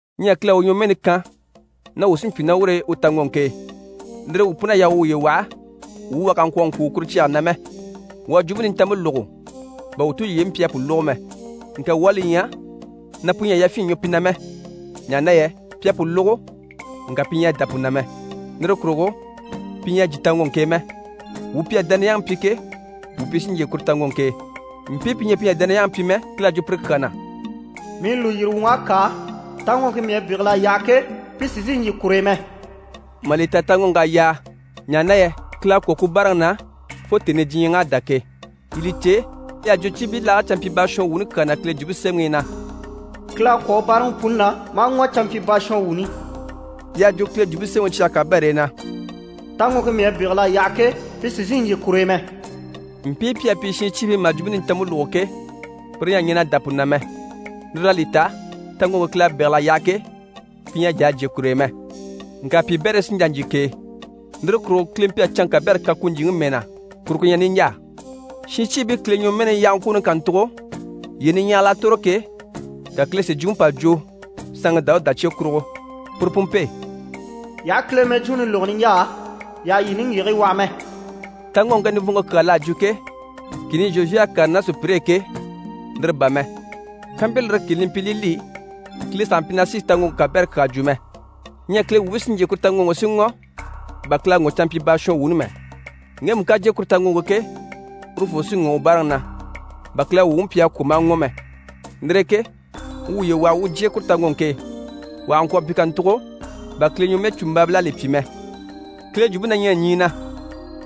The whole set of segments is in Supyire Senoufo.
Ɲyɛ Kile à u ɲwɔmɛɛni kan na wuu sí n‑pyi ná ur'e u taŋɔŋke e. Lire e wuu pun'à yaa wuu wuye waha, wuu wà kà ŋkwɔ̀ ŋkùuŋɔ kuru cyage na mɛ. Wuu à Jwumpe Nintanmpe lógo, bà wuu tulyeyi mpyi a pu lógo mɛ. Ŋka wuu à li ɲya na pu ɲyɛ a yafyin ɲwɔ pi na mɛ, ɲaha na yɛ pi à pu lógo, ŋka pi ɲyɛ a dá pu na mɛ. Lire kurugo pi ɲyɛ a jyè taŋɔŋke e mɛ. Wuu pi à dániyaŋi pyi ke, wuu pi sí n‑jyè kuru taŋɔŋke e. Mpii pi ɲyɛ pi ɲyɛ a dániyaŋi pyi mɛ, Kile à jwo pire kyaa na: «Mii lùyiri wuŋ'à kâa, taŋɔŋke mii à bégel'a yaha ke, pi sì n‑sìi n‑jyè kur'e mɛ.» Mà li ta taŋɔŋk'à yaa, ɲaha na yɛ Kile à kwɔ̀ ku báaraŋi na fo tèni i diɲyɛŋ'à dá ke. Yii li cè, y'à jwo cibilaage canmpyibaashɔnwuuni kyaa na Kile Jwumpe Semɛŋi i na: «Kile à kwɔ̀ u báaraŋi puni na, maa ŋɔ̀ canmpyibaashɔnwuuni» Y'à jwo Kile Jwumpe Semɛŋi cyage kabɛr'e na: «Taŋɔŋke mii à bégel'a yaha ke, pi sì n‑sìi n‑jyè kur'e mɛ.» Mpii pi à pyi shincyiibii mà Jwumpe Nintanmpe lógo ke, pire ɲyɛ a ɲɛn'a dá pu na mɛ. Lire l'à li ta, taŋɔŋke Kile à bégel'a yaha ke, pi ɲyɛ a jà a jyè kur'e mɛ. Ŋka piibɛrii sí n‑jà n‑jyè k'e. Lire kurugo Kile mpyi a canŋke kabɛrɛ kan ku ɲjyìŋi mɛɛ na, kuru ku ɲyɛ niɲjaa. Shincyiibii Kile ɲwɔmɛɛni yahaŋkwooni kàntugo, yyee niɲyahigil'à tòro ke, ka Kile si jwumpe pà jwo saanŋi Dawuda cye kurugo, puru pu mpe: «Yii aha Kile mɛjwuuni lógo niɲjaa, yii àha yii niŋgyigigii waha mɛ.» Taŋɔŋke nivɔnŋke kyaa l'à jwo ke, kìni i Zhozuwe à kàre ná sùpyire e ke, lire bà mɛ. Kampyi lire kìni li mpyi li li, Kile sàha mpyi na sì taŋɔŋke kabɛrɛ kyaa jwo mɛ. Ɲyɛ Kile wuubii sí n‑jyè kuru taŋɔŋke e si ŋɔ̀, bà Kile à ŋɔ̀ canmpyibaashɔnwuuni mɛ. Ŋgemu ká jyè kuru taŋɔŋke e ke, urufoo sí ŋɔ̀ u báaraŋi na, bà Kile à u wuŋi pyi a kwɔ̀ maa ŋɔ̀ mɛ. Lire e ke wuu wuye waha wuu u jyè kuru taŋɔŋke e, wà kà ŋkwɔ̀ mpyi kàntugo bà Kile ɲwɔmɛɛcumbaabil'à li pyi mɛ. Kile jwumpe na ɲyɛ ɲyii na,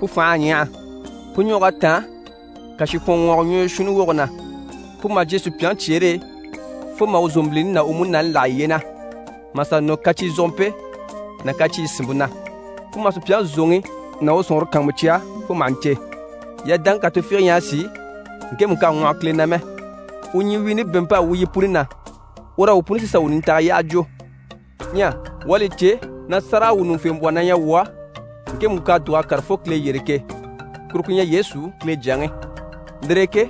pu fành'à ɲyaha. Pu ɲwɔg'à táan kàshikwɔnŋwɔɔgɔ ɲwɔyi shuunni woge na. Pu maha jyè sùpyaŋi cyeere e fo maha u zòmbilini ná u múnaani láha yiye na, mà sà nɔ kacizogompe ná kaciiyi sìnmpe na. Pu maha sùpyaŋi zòŋi ná u sɔ̀nŋɔre kàanmucya fo maha ɲcè. Yadaŋke kà tufiige ɲyɛ a sìi ŋkemu k'à ŋwɔhɔ Kile na mɛ. U ɲyiwiini bɛ̀ɛnmp'à wu yi puni na. Ur'á wuu puni sí sà wuu nintaga yyaha jwo. Ɲyɛ wuu à li cè na sáragawwuɲuŋufembwɔhɔ na ɲyɛ wuu á ŋkemu k'à dùg'a kàre fo Kile yyére ke, kuru ku ɲyɛ Yesu, Kile Jyaŋi. Lire e ke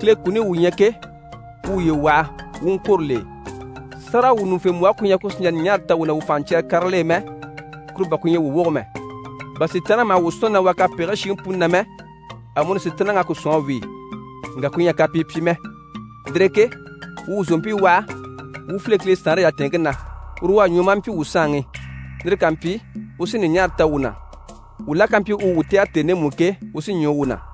Kile kuni i wuu ɲyɛ ke, wuu wuye waha, wuu u ŋkwôro l'e. Sáragawwuɲuŋufembwɔhe ku ɲyɛ ku sì n‑jà ɲùɲaara ta wuu na wuu fànhaɲcyɛrɛrɛ karigil'e mɛ, kuru bà ku ɲyɛ wuu woge mɛ. Bà Sitaanniŋi maha wuu sɔ̀nni na wàa kapegigii shiŋi puni na mɛ, amuni Sitaanniŋi à ku sɔ̀n a wíi, ŋka ku ɲyɛ a kapii pyi mɛ. Lire e ke wuu wuu zòompii waha, wuu file Kile saanre yatɛɛnŋke na, uru u à ɲwɔ maa mpyi wuu saanŋi. Lire ká mpyi, u sí ɲùɲaara ta wuu na. Wuu la ká mpyi u wuu tɛ̀gɛ tèni ndemu i ke, u sí ɲwɔ wuu na.